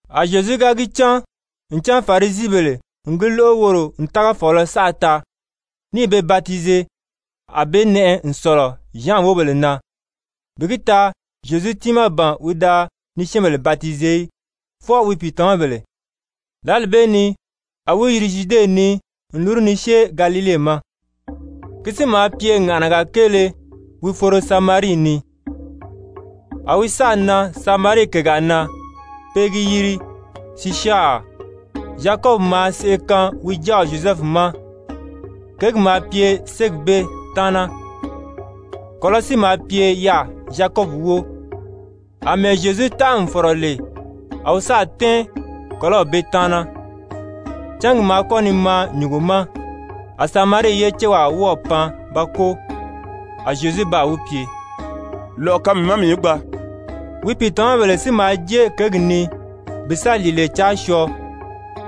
A Zyezu ga gi cán ncan Farisibèle n gi lóʔo woro n tágafɔɔlɔ saʔa taa, ní i be batize a be nɛʔɛ n sɔ̀lɔ Zyan wóbèle na, (bi gi taa Zyezu tiimaa ban wi da ni syɛ́ɛnbèle batize í, fwɔɔ wi pìitamabèle,) lǎli bee ni a wi yiri Zyude ni n lúru ni syée Galile ma. Ki si maa pye ŋàʔanaga kéele wi foro Samarii ni. A wi sáà nan Samarii kègaa na, pe i gi yiri Sisyari, Zyakɔbi maa seʔe kaan wi jáaw Zyozɛfu ma, kěgi maa pye ségi bee taana. Kɔ̀lɔ́ si maa pye yaà Zyakɔbi wóo. Amɛɛ Zyezu tánʔa n fɔ̀rɔ lè, a wi sáà tɛ́ɛn kɔ̀lɔ́w bee taana. Cángi maa kɔ́ ni maa nyùngo ma. A Samarii ye céwaa wɔ́ɔ̀ pan ba kóo. A Zyezu baa wi pye: «Lɔ̀ʔɔ kaan mii ma mii í gbaa.» Wi pìitamabèle si maa jée kěgi ni bi sa lìile caa syɔɔ.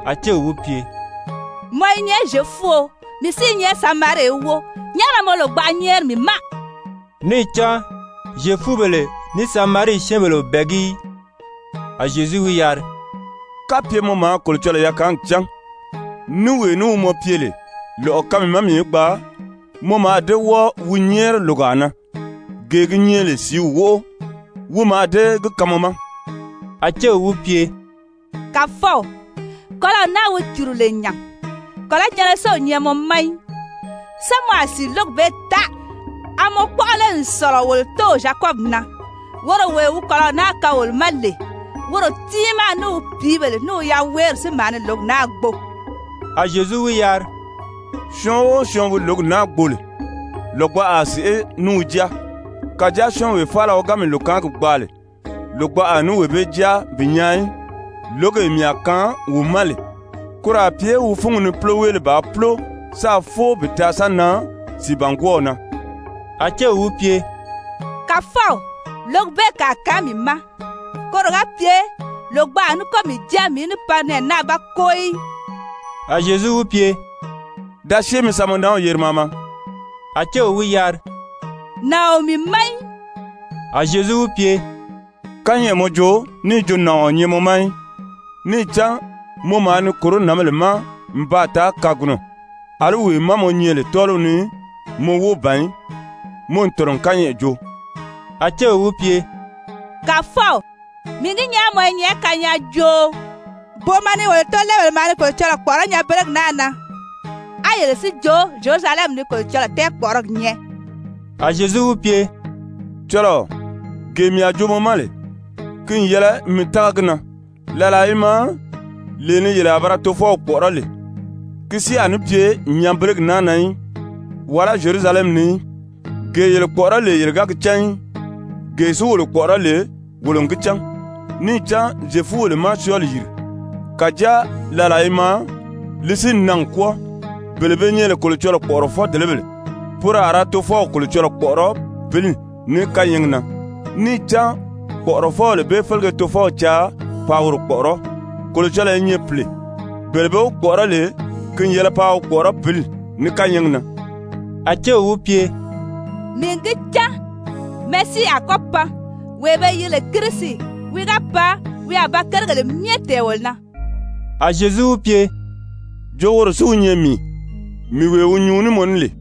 A céw wi pye: «Mɔ i nyɛ Zyefuo, mii si i nyɛ Samarii ye wóo, nyàʔá na mɔ lògbaʔa nyɛ́ɛri mii ma?» (Níì cán Zyefubèle ní Samarii syɛ́ɛnbèle o bɛ̀ɛgí í.) A Zyezu wi yari: «Kapye mɔ maa Kolocɔlɔɔ yakaangi cán, ní wee ní wi mɔ pye lè: Lɔ̀ʔɔ kaan mii ma mii í gbaa, mɔ mǎà dée wɔ́ɔ wi nyɛ́ɛri lògaa na, gee gi nyɛ lè sìíw wóʔo, wi mǎà dée gi kaan mɔ ma.» A céw wi pye: «Kàfɔw, kɔ̀lɔ́w naa wi cùru lè nya, kɔ̀lɔ́jɛnnɛ si o nyɛ mɔ ma í, sán mɔ a sìi lǒgi bee taa? A mɔ kpɔ́ʔɔ lé n sɔ̀lɔ wolo tóow Zyakɔbi na, woro wee wi kɔ̀lɔ́w naa kaan wolo ma lè? Woro tiimaa, ní wi pìíbèle, ní wi yaweeri si maa ni lǒgi naa gbo.» A Zyezu wi yari: «Syɔɔn o syɔɔn wi lǒgi naa gbo lè, lògbaʔa a sèʔé ní wi jáa. Kàjáa syɔ́ɔnwee faala wi ga mii lòkaangi gbaa lè, lògbaʔa a ní wee bee jáa bi nyaa í, lǒgee mii a kaan wi ma lè, koro a pye wi fúngi ni púloweele bàā púlo sáā fóo bi taa sa nan sìibangwɔɔw na.» A céw wi pye: «Kàfɔw, lǒgi bee kàa kaan mii ma, koro ga pye lògbaʔa a ní kɔ́ mii jáa mii í ní pan nɛɛ naa ba kóo í.» A Zyezu wi pye: «Da syée mi sa mɔ nanw yeri maa maa.» A céw wi yari: «Nàɔn o mii ma í.» A Zyezu wi pye: «Kányɛʔɛ mɔ joo níì jo, nàɔn o nyɛ mɔ ma í. Níì cán mɔ maa ni kòró nǎnbèle ma n baa taa kagunɔ. Alí wee má mɔ nyɛ lè tɔ́ɔliw ni, mɔ wóo ban í. Mɔ n tɔ̀nɔ n kányɛʔɛ joo.» A céw wi pye: «Kàfɔw, mii n gi nyaa mɔ i nyɛ kanyaajooo. Booma ni wolo tóolɛɛbèle maa ni Kolocɔlɔɔ kpɔ̀ʔɔrɔ́ nyanbelegi naa na, á yele si jo Zyerusalɛmi ni Kolocɔlɔɔ tɛɛkpɔʔɔrɔgi nyɛ.» A Zyezu wi pye: «Cɔlɔɔ, gee mii a joo mɔ ma lè, ki n yɛlɛ mi tága gi na, làlaa i maa lee ni yele a ba ra Tofɔw kpɔ̀ʔɔrɔ́ lè, ki si a ní pye nyanbelegi naa na í, wàlá Zyerusalɛmi ni í. Gee yele kpɔ̀ʔɔrɔ́ lè yele ga gi cán í. Gee si wolo kpɔ̀ʔɔrɔ́ lè wolo n gi cán, níì cán Zyefubèle má syɔɔli yìri. Kàjáa làlaa i maa, li si n nan n kwɔ́ɔ, bele be nyɛ lè Kolocɔlɔɔ kpɔ̀ʔɔrɔfɔ-dèlebèle, poro a ra Tofɔw Kolocɔlɔɔ kpɔ̀ʔɔrɔ́ pǐli ní kányɛɛgi na. Níì cán kpɔ̀ʔɔrɔfɔbèle bee félege Tofɔw caa paa woro kpɔ̀ʔɔrɔ́. Kolocɔlɔɔ i nyɛ pìle. Bele be wi kpɔ̀ʔɔrɔ́ lè, ki n yɛlɛ paa wi kpɔ̀ʔɔrɔ́ pǐli ní kányɛɛgi na.» A céw wi pye: «Mii n gi cán Mesii a kɔ́ pan, (wee be yiri lè Kirisi.) Wi ga pan, wi a ba kérigèle myɛ tɛ̀ɛn wolo na.» A Zyezu wi pye: «Jo woro si wi nyɛ mii, mii wee wi nyuu ní mɔ ní lè.»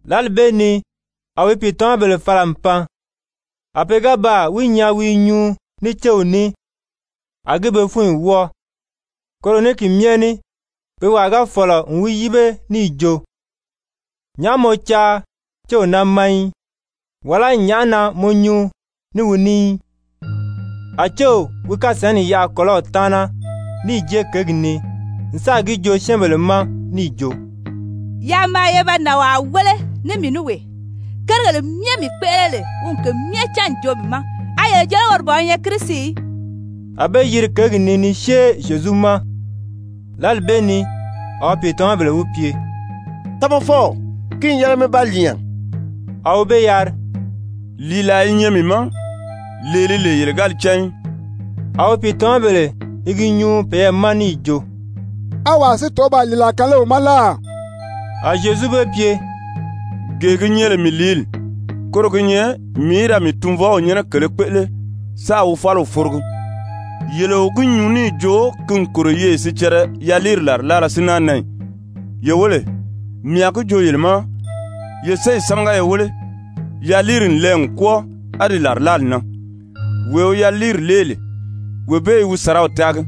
Lǎli bee ni a wi pìitamabèle fala n pan. A pe ga baa wi nyaa wi i nyuu ní céw ní, a gi be fúnyi wɔ́ɔ. Koro ní ki myɛ ní pe wàa ga fɔ̀lɔ n wi yíbe níì jo: «Nyàʔá mɔ caa céw naa ma í,» wàlá «nyàʔá na mɔ nyuu ní wi ní í?» A céw wi kasǎnni yaʔa kɔ̀lɔ́w taana, níì jée kěgi ni n sáà gi joo syɛ́ɛnbèle ma níì jo: «Yaa maa ye ba nànwaa wéle ní mii ní wee, kérigèle myɛ mii kpéʔele lè, wi n ke myɛ cán n joo mii ma. A yele jo lé woro ban wi nyɛ Kirisi í?» A be yiri kěgi ni ni syée Zyezu ma. Lǎli bee ni a wi pìitamabèle wi pye: «Tamafɔw, ki n yɛlɛ mi ba lìi nya.» A wi be yari: «Lìilaa i nyɛ mii ma, lee li lè yele ga li cán í.» A wi pìitamabèle i gi nyuu peyɛɛ ma níì jo: «A wàa si tɔ̀ʔɔ́ baa lìilaa kaan lé wi ma láà?» A Zyezu be pye: «Gee gi nyɛ lè mii lìíli, koro gi nyɛ mii í da mii Tunvɔw nyɛ́nɛ kèlē kpéʔele sáā wi fáliw forogi. Yele o gi nyuu níì jo ki n kòro yeye sicɛrɛ yaliiri làrilaala si náa nan ì? Ye wéle, mii a gi joo yele ma, ye séyi sámaga ye wéle, yaliiri n lɛɛ n kwɔ́ɔ, a di làrilaali nan. Wee wi yaliiri lée lè, wee bee i wi sàraw taagi,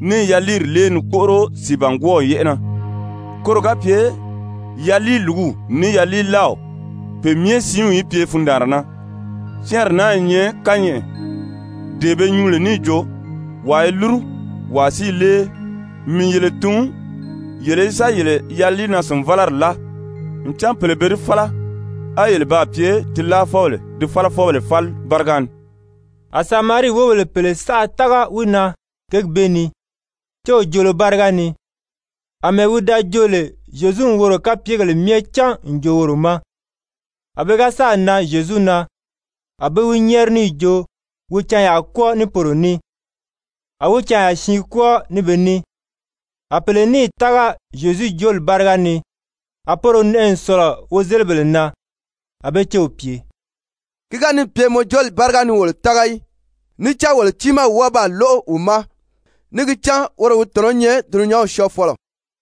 ní i yaliiri lée ni kpóʔoro sìibangwɔɔw yɛ́ʔɛ na, koro ga pye yaliilùguw ní yaliilaaw, pe myɛ siinw í pye fundaanra na. Syɛ́ɛnri naa i nyɛ kányɛʔɛ, dee be nyuu lè níì jo: ‹Wàa i lúru, wàa si i lée.› Mii n yele tun, yele í sa yele yaliinaa-sìnvalari láa. Ncan pèle be di fála, á yele baa pye di láafɔbèle di fálafɔbèle fáli báriga ni.» A Samarii wóbèle pèle saʔa tága wi na kěgi bee ni, céw joolo báriga ni, àmɛɛ wi da jo lè Zyezu n woro kapyegèle myɛ cán n joo woro ma. A pe ga sáà nan Zyezu na, a be wi nyɛ́ɛri níì jo wi canyaa kwɔ́ɔ ní poro ní. A wi canya siin kwɔ́ɔ ní be ní. A pèle níì tága Zyezu jooli báriga ni, a poro nɛʔɛ n sɔ̀lɔ wozelibèle na. A be céw pye: «Ki ga níì pye mɔ jooli báriga ni wolo tága í. Níì cán wolo tiimaa n wɔ́ɔ baa lóʔo wi ma, níì gi cán woro wi tɔ̀nɔ́ nyɛ dulunyanw Syɔɔfɔlɔ.»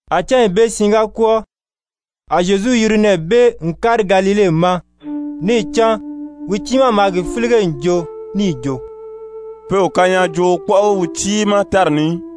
A cányi bee siin ga kwɔ́ɔ, a Zyezu yiri nɛɛ bee n kári Galile ma. Níì cán wi tiimaa maa gi fílige n joo níì jo: «Pe o kanyaajooo kpɔ́ʔɔgi wi tiimaa tári ni í.»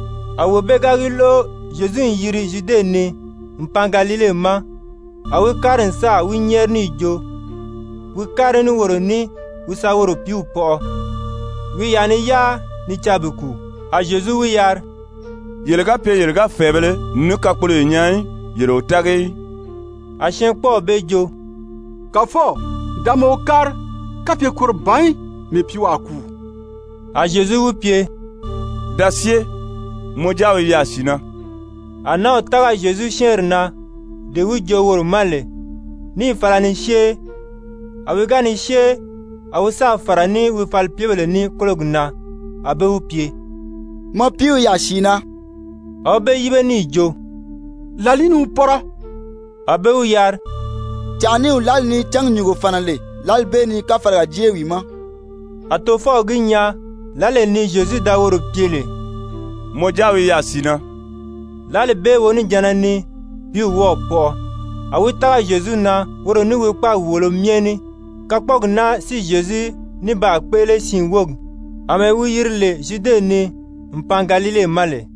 A wee bee ga gi lóʔo Zyezu n yiri Zyude ni n pan Galile ma, a wi kári n sáà wi nyɛ́ɛri níì jo wi kári ní woro ní wi sa woro pìíw pɔʔɔ, wi i yaà ni yáa ni caa bi kùu. A Zyezu wi yari: «Yele ga pye yele ga fɛ̀ɛbēle ní kakpoloyo nyaa í, yele o tági í.» A syɛɛnkpɔɔw bee jo: «Kàfɔw, da maa wo kári, kapye koro ban í, mii pìíw a kùu.» A Zyezu wi pye: «Da syée, mɔ jáaw i yaà sìi na.» A nǎnw tága Zyezu syɛ́ɛnri na, dee wi joo woro ma lè, níì fala ni syée. A wi ga ni syée, a wi sáà fàra ní wi falipyebèle ní kólogi na, a be wi pye: «Mɔ piiw i yaà sìi na.» A wi be yíbe níì jo: «Làlìí ni wi pɔ́rɔ?» A be wi yari: «Cànʔaniw lǎli ni cángi nyùngo fàna lè, lǎli bee ni káfalaga jée wi ma.» A tofɔw gi nyaa lǎlee ni Zyezu da woro pye lè: «Mɔ jáaw i yaà sìi na,» lǎli bee wonijanna ni pìíw wɔ́ɔ̀ pɔʔɔ. A wi tága Zyezu na, woro ní wi kpáagi wòolo myɛ ní. Kakpɔɔgi naa si Zyezu ní baa kpéʔele siin wógi, àmɛɛ wi yiri lè Zyude ni n pan Galile ma lè.